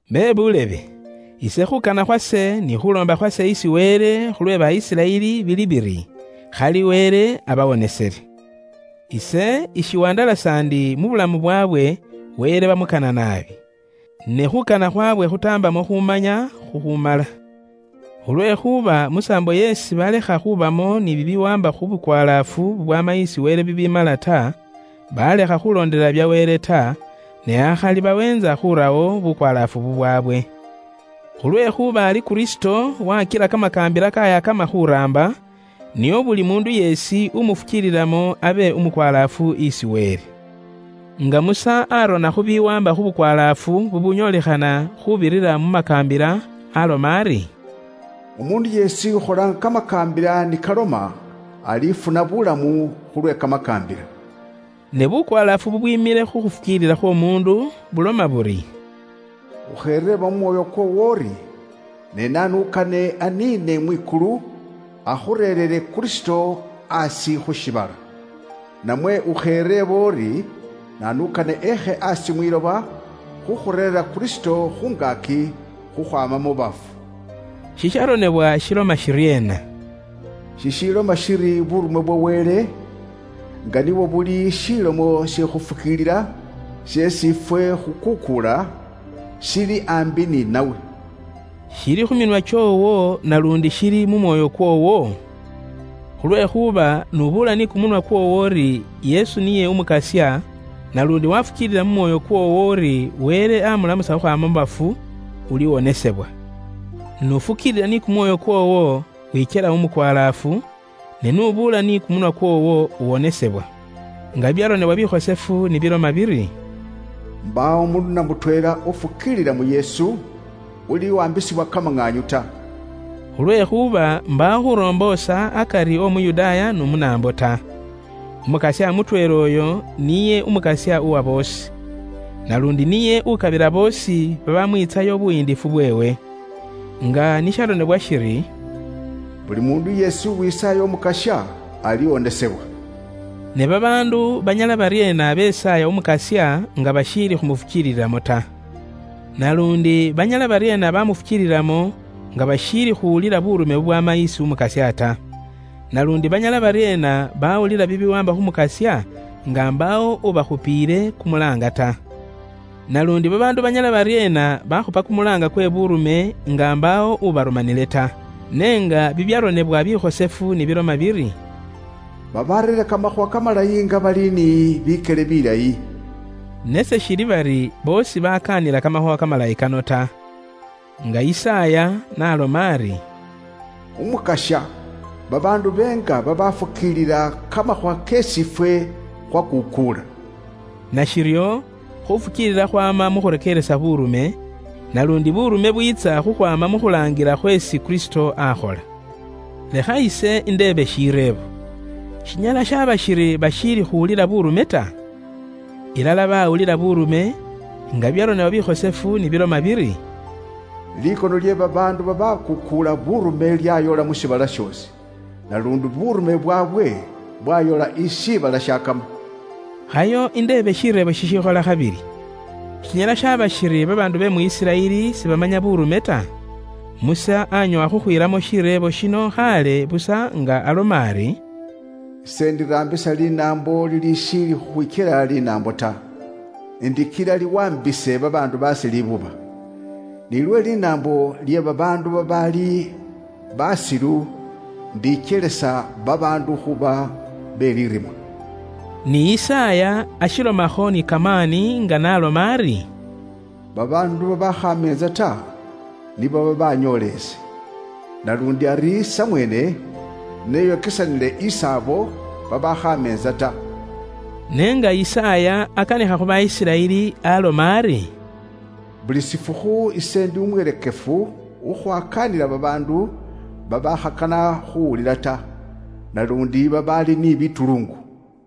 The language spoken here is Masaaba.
Bebuulebe, ise khuukana khwe kumwoyo kwase ni khuuloomba khwase isi Wele khu lwe ba Isiraeli bili biri, khali Wele abawonesele. Ise ishiwandalasa ndi mu bulamu bwaabwe, Wele bamukana naabi. Ne khuukana khwaabwe khutaambamo khuumanya khukhuumala. Khulwekhuuba mu saambo yeesi balekha khubamo ni bibiwaamba khu bukwalaafu bubwama isi Wele bibiimala ta, baalekha khulondelela bya Wele ta, ne akhali baweentsa khurawo bukwalaafu bubwaabwe. Khulwekhuuba ari Kristo wakila kamakaambila kayakama khuraamba, nio buli muundu yeesi umufukiililamo abe umukwalaafu isi Wele. Nga Musa arona khu bibiwaamba khu bukwalaafu bubunyolikhana khuubirira mu makaambila aaloma ari, “Umuundu yeesi ukhola nga kamakaambila ni kaloma, alifuna buulamu khulwe kamakaambila.” Ne bukwalaafu bubwiimile khu khufukiilila khw'omuundu buloma buri, “Ukhereeba mu mwoyo kwoowo uri, ‘Ne naanu ukane aniine mwikulu akhureerere Kristo asi khu shiibala?’ Namwe ukhereeba uri, ‘Naanu ukane eekhe aasi imakoombe khukhureera Kristo khungaaki, khukhwaama mu bafu?’” Shisharonebwa shiloma shiryeena? Sishiloma shiri, buurume bwa Wele, nga nibwo buli shilomo she khuufukiilila sheesi ifwe khukuukuula, shili aambi ni nawe. Shili khu minwa kyoowo, naluundi shili mu mwoyo kwoowo? Khulwekhuuba iwe n'ufukiilisa ni kumunwa kwoowo uri Yesu niye Umukasya, naluundi wafukiilila mu mwoyo kwoowo uri Wele amulamusa khukhwaama mu bafu, uliwonesebwa. N'ufukiilila ni kumwoyo kwoowo, wikyela umukwalaafu; ne n'ubuula ni kumunwa kwoowo, uwonesebwa. Nga bibyaronebwa bikhosefu ni biloma biri, “Mbaawo umuundu namutweela ufukiilila mu Yesu, uliwaambisibwa kamaŋaanyu ta.” Khulwekhuuba mbaawo khuromboosa akari w'Omuyudaaya n'Umunaambo ta. Umukasya mutweela uyo, niye Umukasya uwa boosi. Naluundi niye ukabila boosi babamwiitsayo buyiindifu bweewe. Nga ni sharonebwa shiri, “Buli muundu yeesi uwisaaya Umukasya, aliwonesebwa.” Ne babaandu banyala baryeena besaaya Umukasya nga bashiili khumufukiililamo ta? Naluundi banyala baryeena bamufukiililamo, nga bashiili khuwulila buurume bubwaama isi Umukasya ta? Naluundi banyala baryeena baawulila bibiwaamba khu Mukasya, nga imbaawo ubakhupiile kumulaanga ta? Naluundi babaandu banyala baryeena bakhupa kumulaanga kwe buurume, nga imbaawo ubarumanile ta? Ne nga bibyaronebwa bikhosefu ni biloma biri, “Babareera kamakhuuwa kamalayi nga bali ni bikele bilayi!” Ne seshili bari boosi bakaanila kamakhuuwa kamalayi kano ta. Nga Yisaaya n'aloma ari, “Umukasya, babaandu beenga babafukiilila kamakhuuwa keesi ifwe khwakuukuula?” Nashiryo, khufukiilila khwaama mu khurekeeresa buurume, naluundi buurume bwiitsa khukhwaama mu khulaangila khweesi Kristo akhola. Lekha ise indeebe shireebo: Shinyala shaba shiri bashiili khuwulila buurume ta? Ilala bawulila buurume, nga bibyaronebwa bikhosefu ni biloma biri, “Likono lye babaandu babakuukuula buurume lyayola mu shiibala shoosi. Naluundi buurume bwaabwe bwayola isi shiibala shakama.” Khayo indeebe shireebo shishikhola khabili: Shinyala shaba shiri babaandu be mu Isiraeli sibamanya buurume ta? Musa anyoowa khukhwiilamo shireebo shino khaale busa nga aloma ari, “Ise indiraambisa linaambo lilishiili khukhwikyela linaambo ta, indikila liwaambise babaandu baase libuba, ni lwe linaambo lye babaandu babaali basilu indikyelisa babaandu khuuba be lirima.” Ni Yisaaya ashilomakho ni kamaani nga n'aloma ari, “Babaandu babaakhameentsa ta, nibo babanyoola ise; naluundi ari samweene neyokesanile isi abo babaakhaamentsa ta.” Ne nga Yisaaya akanikha khu ba Isiraeli aloma ari, “Buli shifukhu ise indi umwirekefu khukhwakaanila babaandu babaakhakana khuwulila ta, naluundi babaali ni bituluungu.”